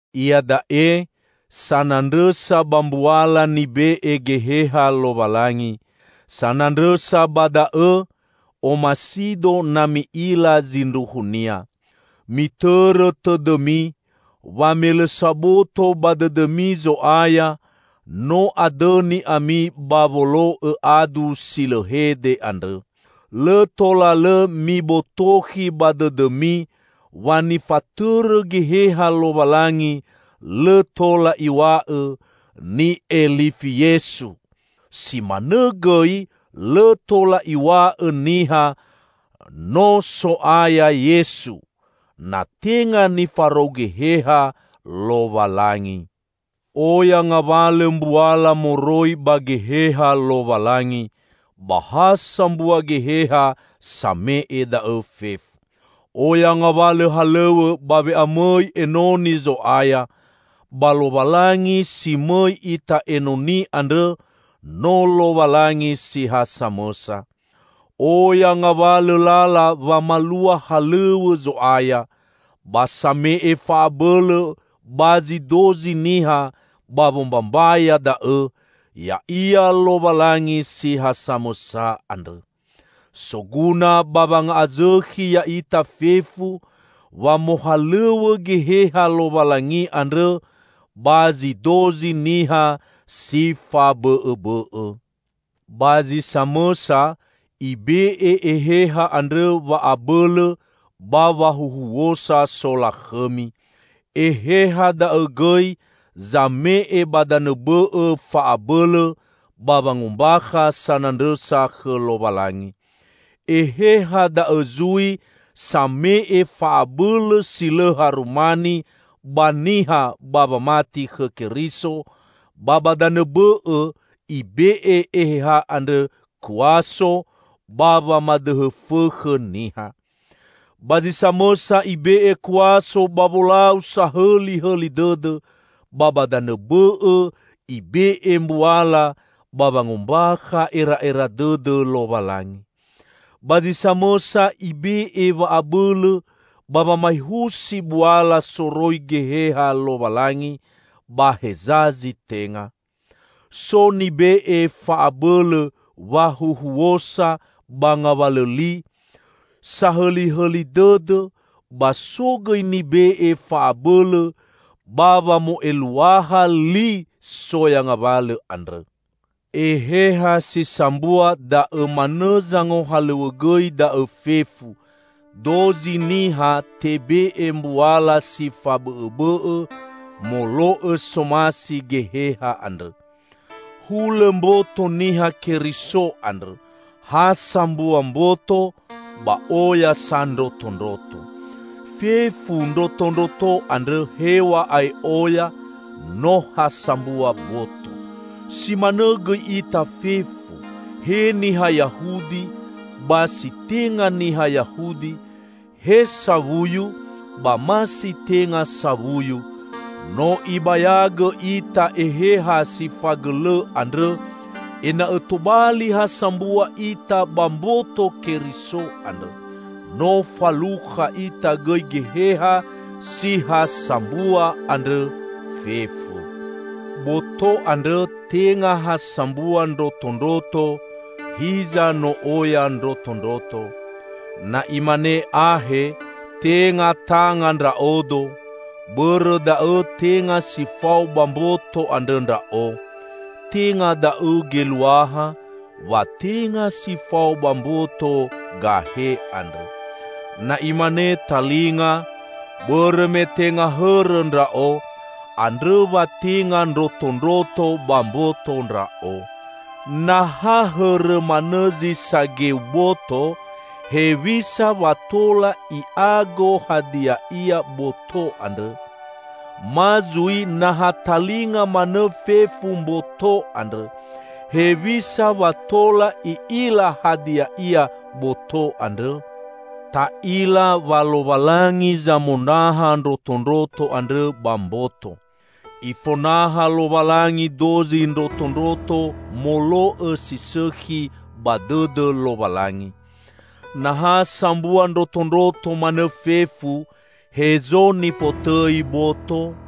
Iada'e sanandrõsa ba mbuala nibe'e Geheha Lowalangi. Sanandrõsa ba da'õ, omasido na mi'ila zindruhunia. Mitõrõ tõdõmi wa me lõ saboto ba dõdõmi Zo'aya, no adõni ami ba wolo'õ adu si lõ hede andrõ. Lõ tola lõ mibotokhi ba dõdõmi wa nifatõrõ Geheha Lowalangi, lõ tola iw̃a'õ, "Ni'elifi Yesu!" Si manõ gõi lõ tola iw̃a'õ niha, "No So'aya Yesu!" na tenga nifarou Geheha Lowalangi. Oya ngawalõ mbuala moroi ba Geheha Lowalangi, ba ha sambua Geheha same'e da'õ fefu. Oya ngawalõ halõw̃õ ba we'amõi enoni Zo'aya, ba Lowalangi si mõi ita enoni andrõ, no Lowalangi si ha samõsa! Oya ngawalõ lala wamalua halõw̃õ Zo'aya, ba same'e fa'abõlõ ba zi dozi niha ba wombambaya da'õ ya'ia Lowalangi si ha samõsa andrõ. Soguna ba wanga'azõkhi ya'ita fefu wa mohalõw̃õ Geheha Lowalangi andrõ ba zi dozi niha si fabõ'õbõ'õ. Ba zi samõsa, Ibe'e Eheha andrõ wa'abõlõ ba wahuhuosa solakhõmi. Eheha da'õ gõi zame'e ba danõ bõ'õ fa'abõlõ ba wangombakha sanandrõsa khõ Lowalangi. Eheha da'õ zui zame'e fa'abõlõ si lõ harumani ba niha ba wamati khõ Keriso; ba ba danõ bõ'õ Ibe'e Eheha andrõ kuaso ba wamadõhõ fõkhõ niha. Ba zi samõsa Ibe'e kuaso ba wolau sahõlihõli dõdõ, ba ba danõ bõ'õ Ibe'e mbuala ba wangombakha era'era dõdõ Lowalangi. Ba zi samõsa Ibe'e wa'abõlõ ba wamaehusi buala soroi Geheha Lowalangi ba heza zi tenga. So nibe'e fa'abõlõ wahuohuosa ba ngawalõ li sahõlihõli dõdõ, ba so gõi nibe'e fa'abõlõ ba wamo'eluaha li soya ngawalõ andrõ. Eheha si sambua da'õ manõ zangohalõw̃õgõi da'õ fefu; dozi niha tebe'e mbuala si fabõ'õbõ'õ molo'õ somasi Geheha andrõ. Hulõ mboto Niha Keriso andrõ; ha sambua mboto, ba oya sa ndrotondroto. Fefu ndrotondroto andrõ, hew̃a'ae oya, no ha sambua boto. Si manõ gõi ita fefu, he niha Yahudi ba si tenga niha Yahudi, he sawuyu ba ma si tenga sawuyu; no ibayagõ ita Eheha si fagõlõ andrõ, ena'õ tobali ha sambua ita ba mboto Keriso andrõ. No falukha ita gõi Geheha si ha sambua andrõ fefu. Boto andrõ tenga ha sambua ndrotondroto, hiza no oya ndrotondroto. Na imane ahe, "Tenga tanga ndra'odo, bõrõ da'õ tenga si fao ba mboto andrõ ndra'o," tenga da'õ geluaha wa tenga si fao ba mboto gahe andrõ. Na imane talinga, "Bõrõ me tenga hõrõ ndra'o," andrõ wa tenga ndrotondroto ba mboto ndra'o. Na ha hõrõ manõ zi sageu boto, hewisa wa tola i'ago hadia ia boto andrõ? Ma zui na ha talinga manõ fefu mboto andrõ, hewisa wa tola i'ila hadia ia boto andrõ? Ta'ila wa Lowalangi zamonaha ndrotondroto andrõ ba mboto. Ifonaha Lowalangi dozi ndrotondroto molo'õ si sõkhi ba dõdõ Lowalangi. Na ha sambua ndrotondroto manõ fefu, hezo nifotõi boto?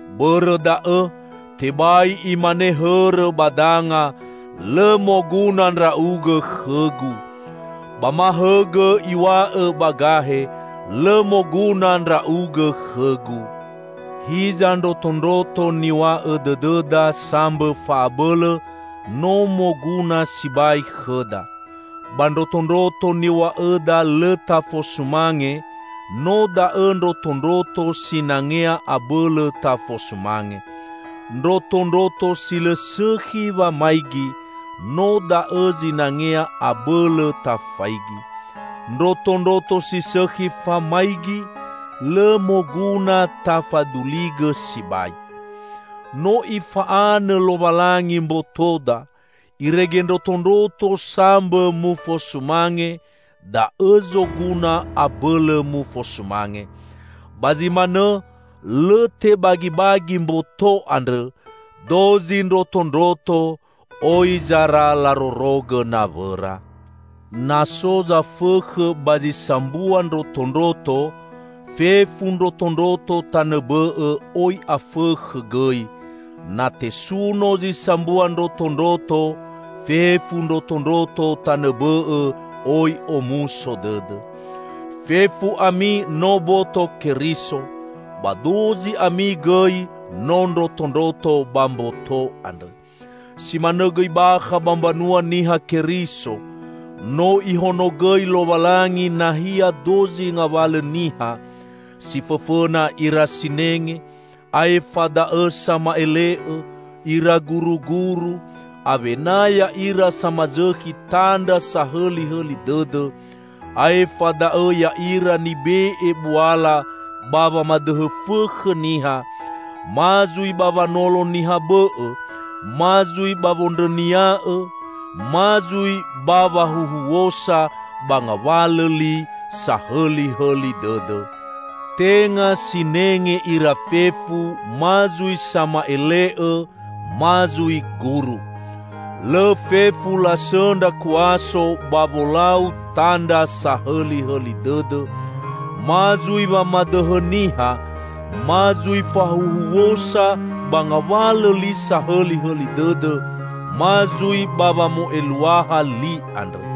Bõrõ da'õ, tebai imane hõrõ ba danga, "Lõ moguna ndra'ugõ khõgu!" Ba ma hõgõ iw̃aõ ba gahe, "Lõ moguna ndra'ugõ khõgu." Hiza ndrotondroto niw̃a'õ dõdõda sambõ fa'abõlõ, no moguna sibai khõda. Ba ndrotondroto niw̃a'õda lõ tafosumange, no da'õ ndrotondroto sinangea abõlõ tafosumange. Ndrotondroto si lõ sõkhi wamaigi, no da'õ zinangea abõlõ tafaigi. Ndrotondroto si sõkhi famaigi, lõ moguna tafaduligõ sibai. No Ifa'anõ Lowalangi mbotoda irege ndrotondroto sambõ mufosumange, da'õ zoguna abõlõ mufosumange. Ba zi manõ lõ tebagibagi mboto andrõ; dozi ndrotondroto oi zara larorogõ nawõra. Na so zafõkhõ ba zi sambua ndrotondroto, fefu ndrotondroto tanõ bõ'õ oi afõkhõ gõi; na tesuno zi sambua ndrotondroto, fefu ndrotondroto tanõ bõ'õ oi omuso dõdõ. Fefu ami no boto Keriso, ba dozi ami gõi no ndrotondroto ba mboto andrõ. Si manõ gõi bakha ba mbanua Niha Keriso, no Ihonogõi Lowalangi nahia dozi ngawalõ niha: Si fõfõna ira sinenge; aefa da'õ sama'ele'õ, ira guruguru, awena ya'ira samazõkhi tandra sahõlihõli dõdõ, aefa da'õ ya'ira nibe'e buala ba wamadõhõ fõkhõ niha, ma zui ba wanolo niha bõ'õ, ma zui ba wondrõnia'õ, ma zui ba wahuhuosa ba ngawalõ li sahõlihõli dõdõ. Tenga sinenge ira fefu, ma zui sama'ele'õ, ma zui guru. Lõ fefu lasõndra kuaso ba wolau tandra sahõlihõli dõdõ, ma zui wamadõhõ niha, ma zui fahuhuosa ba ngawalõ li sahõlihõli dõdõ, ma zui ba wamo'eluaha li andrõ.